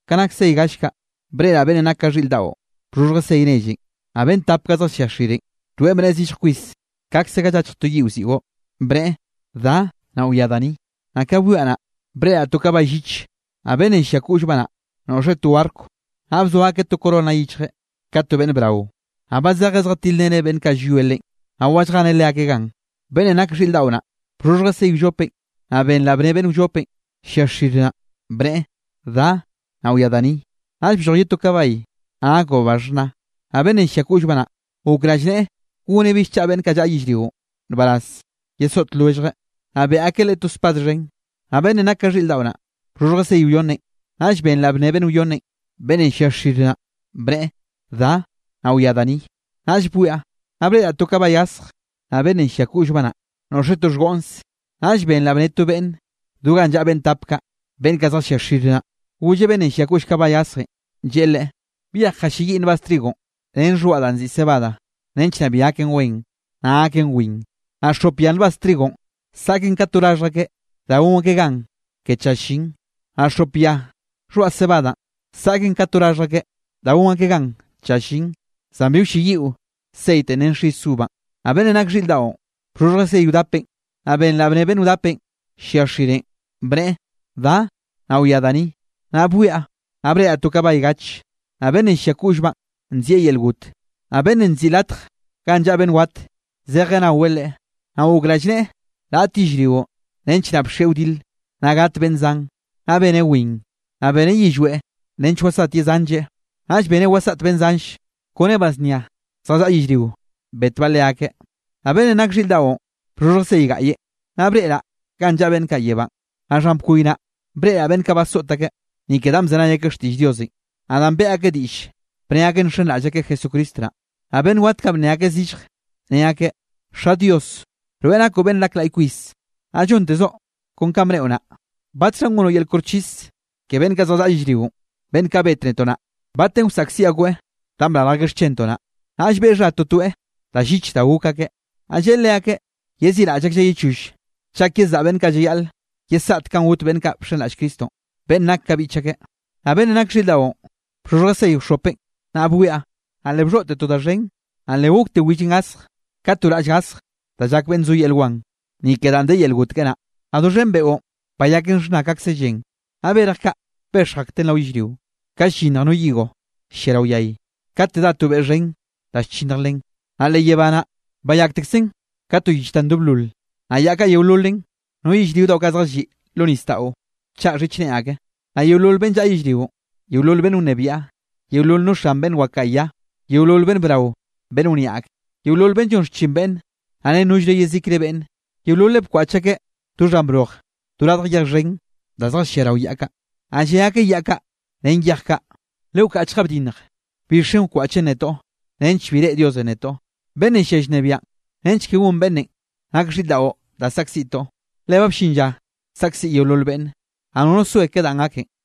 Ka nak sey gall kaꞌ, breꞌraꞌ beꞌnnenꞌ nak ka xhiꞌr daꞌon bxhoxhjeꞌ sey nellenꞌ, naꞌ beꞌnn tap kaꞌ zjallia xirenꞌ, toeꞌ bnneꞌe zillj kwis kaꞌkze ga llachj to yiꞌwziꞌo, bneꞌe: —Da, naꞌ wia da ni. Naꞌ ka bwiaꞌ naꞌ, breꞌraꞌ to kabay lliche, naꞌ beꞌnnenꞌ llia koꞌllbaꞌ naꞌ noꞌxeꞌ to arco. Naꞌ bzoa akeꞌ to corona yichjeꞌ ka to beꞌnn brao, naꞌ ba zejeꞌ zjatilreneꞌ beꞌnn kaꞌ llwie leꞌen, naꞌ wa lljeneꞌ leakeꞌ gan. Beꞌnnenꞌ nak xhiꞌr daꞌo naꞌ, bxhoxhjeꞌ sey wllopenꞌ, naꞌ benraꞌ bnne beꞌnn wllopenꞌ llia xir naꞌ, bneꞌe: —Da, naꞌ wia da ni. Naꞌll blloj ye to kabay, naꞌ nakbaꞌ ba xhna, naꞌ beꞌnnenꞌ llia koꞌllbaꞌ naꞌ, gok rallneꞌe goneꞌ bill chaꞌa beꞌnn kaꞌ llaꞌa yellrionꞌ nbaraz yesoꞌt lwelljeꞌ, naꞌ beꞌe akeꞌ leꞌe to spad xhen. Naꞌ beꞌnnenꞌ nak ka xhiꞌr daꞌo naꞌ, bxhoxhjeꞌ sey wyonnenꞌ, naꞌll benraꞌ bnne beꞌnn wyonnenꞌ, beꞌnnenꞌ llia xir naꞌ, bneꞌe: —Da, naꞌ wia da ni. Naꞌll bwiaꞌ, naꞌ breꞌraꞌ to kabay gasje, naꞌ beꞌnnenꞌ llia koꞌllbaꞌ naꞌ, noꞌxeꞌ to xhgoꞌnse. Naꞌll benraꞌ bnne to beꞌnne do ganꞌ llaꞌa beꞌnn tap kaꞌ, beꞌnn kaꞌ zjallia xir naꞌ, golleꞌ beꞌnnenꞌ llia koꞌll kabay gasjenꞌ, lleꞌe leꞌe: —Byej jalliayiꞌ nbaz trigonꞌ ren xhoaꞌ danꞌ nziꞌi cebada nench naꞌ bi gaken wen, naꞌ gaken win, naꞌ xop ya nbaz trigonꞌ saꞌken ka to raxhj akeꞌ da gon akeꞌ gan ke tlla llin, naꞌ xop ya xhoaꞌ cebadanꞌ saꞌken ka to raxhj akeꞌ da gon akeꞌ gan tlla llin, zan bi wlleyiꞌo ceitenꞌ ren xis uva. Naꞌ beꞌnnenꞌ nak xhiꞌr daꞌon, bxhoxhjeꞌ sey wdapenꞌ, naꞌ benraꞌ bnne beꞌnn wdapenꞌ llia xirenꞌ, bneꞌe: —Da, naꞌ wia da ni. Naꞌ bwiaꞌ, naꞌ breꞌraꞌ to kabay gache, naꞌ beꞌnnenꞌ llia koꞌllbaꞌn nzieꞌ Yel Got, naꞌ beꞌnnenꞌ nziꞌi Latj Ganꞌ Llaꞌa Beꞌnn Wat, zejeꞌ naweꞌ leꞌe, naꞌ gok rallneꞌe raꞌt yellrionꞌ nench naꞌ bxieꞌ wdile, naꞌ gat beꞌnn zan, naꞌ beneꞌ win. Naꞌ beneꞌ yillweꞌ nench wasaꞌt ye zanlleꞌ, naꞌll beneꞌ wasaꞌt beꞌnn zanlle kone ba znia zjallaꞌa yellrio betbaꞌ leakeꞌ. Naꞌ beꞌnnenꞌ nak xhiꞌr daꞌon bxhoxhjeꞌ sey gaꞌye, naꞌ breꞌraꞌ ganꞌ llaꞌa beꞌnn kaꞌ yebánꞌ, naꞌ xhan bkoy naꞌ, breꞌraꞌ beꞌnn kaꞌ basoꞌt akeꞌ, ni ke danꞌ bzenay akeꞌ xtiꞌll Diosenꞌ, naꞌ danꞌ beꞌe akeꞌ diꞌll, bne akeꞌ nxenraꞌll akeꞌ Jesucristo naꞌ. Naꞌ beꞌnn wat kaꞌ bnne akeꞌ zillje, ne akeꞌ: —Xa Dios, rweꞌ nakoꞌ beꞌnn nak laꞌy kwis, naꞌ llontezoꞌ kon kanꞌ bneꞌo naꞌ. ¿Batxhanꞌ gonoꞌ yel koxchis ke beꞌnn kaꞌ zjallaꞌa yellrionꞌ, beꞌnn kaꞌ bet netoꞌ naꞌ? ¿Batenꞌ wasaꞌkziꞌ akoeꞌ danꞌ brarj akeꞌ xchentoꞌ naꞌ? Naꞌll beꞌe xha totoeꞌ da llich da gok akeꞌ. Naꞌ lleꞌe leakeꞌ yeziꞌraꞌll aklleꞌ ye choll chak yezaꞌa beꞌnn llayaꞌl yesaꞌt kanꞌ got beꞌnn kaꞌ bxenraꞌll Cristonꞌ, beꞌnn nak ka biꞌch ake. Naꞌ beꞌnnenꞌ nak xhiꞌr daꞌon, bxhoxhjeꞌ sey wxhopenꞌ, naꞌ bwiaꞌ, naꞌ le bxhoꞌte to da xhen, le gokte willenꞌ gasje ka to raꞌll gasje da llak beꞌnn zo yel wan, ni ke danꞌ de yel got keꞌe naꞌ, naꞌ doxhen beꞌon bayaken xhna kaꞌkze llen. Naꞌ berj kaꞌ bexj akten rao yellrio, ka llyinnj no higo llia rao yay, kate dá to beꞌ xhen da llchinnj len. Naꞌ leꞌ yebá naꞌ, bayaktekzen ka to yich da ndoblol, naꞌ yaꞌ kaꞌ yeololen, no yellrio daꞌo kaꞌ zjalliꞌ lo nisdaꞌon, bchaꞌa xhichne ake. Naꞌ yeolol beꞌnn llaꞌa yellrionꞌ, yeolol beꞌnn wnebiaꞌ, yeolol no xan beꞌnn wakaꞌa ya, yeolol beꞌnn brao beꞌnn wniaꞌ ak, yeolol beꞌnn llon xchin beꞌnne, naꞌ ren nollre yezikre beꞌnne, yeololeꞌ bkwaꞌch akeꞌ do xhan broj, do radj yej xhen da zjallia rao yaꞌ kaꞌ. Naꞌ lle akeꞌ yaꞌ kaꞌ ren yej kaꞌ: —Lewkaꞌchga bdinnj, bixen wkwaꞌchen netoꞌ nench bi reꞌe Diosenꞌ netoꞌ, beꞌnnenꞌ llia llnebiaꞌn, nench ke gonn beꞌnnenꞌ nak xhiꞌr daꞌo da saꞌkziꞌtoꞌ. Le ba bllin lla saꞌkziꞌ yeolol beꞌnne, naꞌ nono soe ke danꞌ gaken.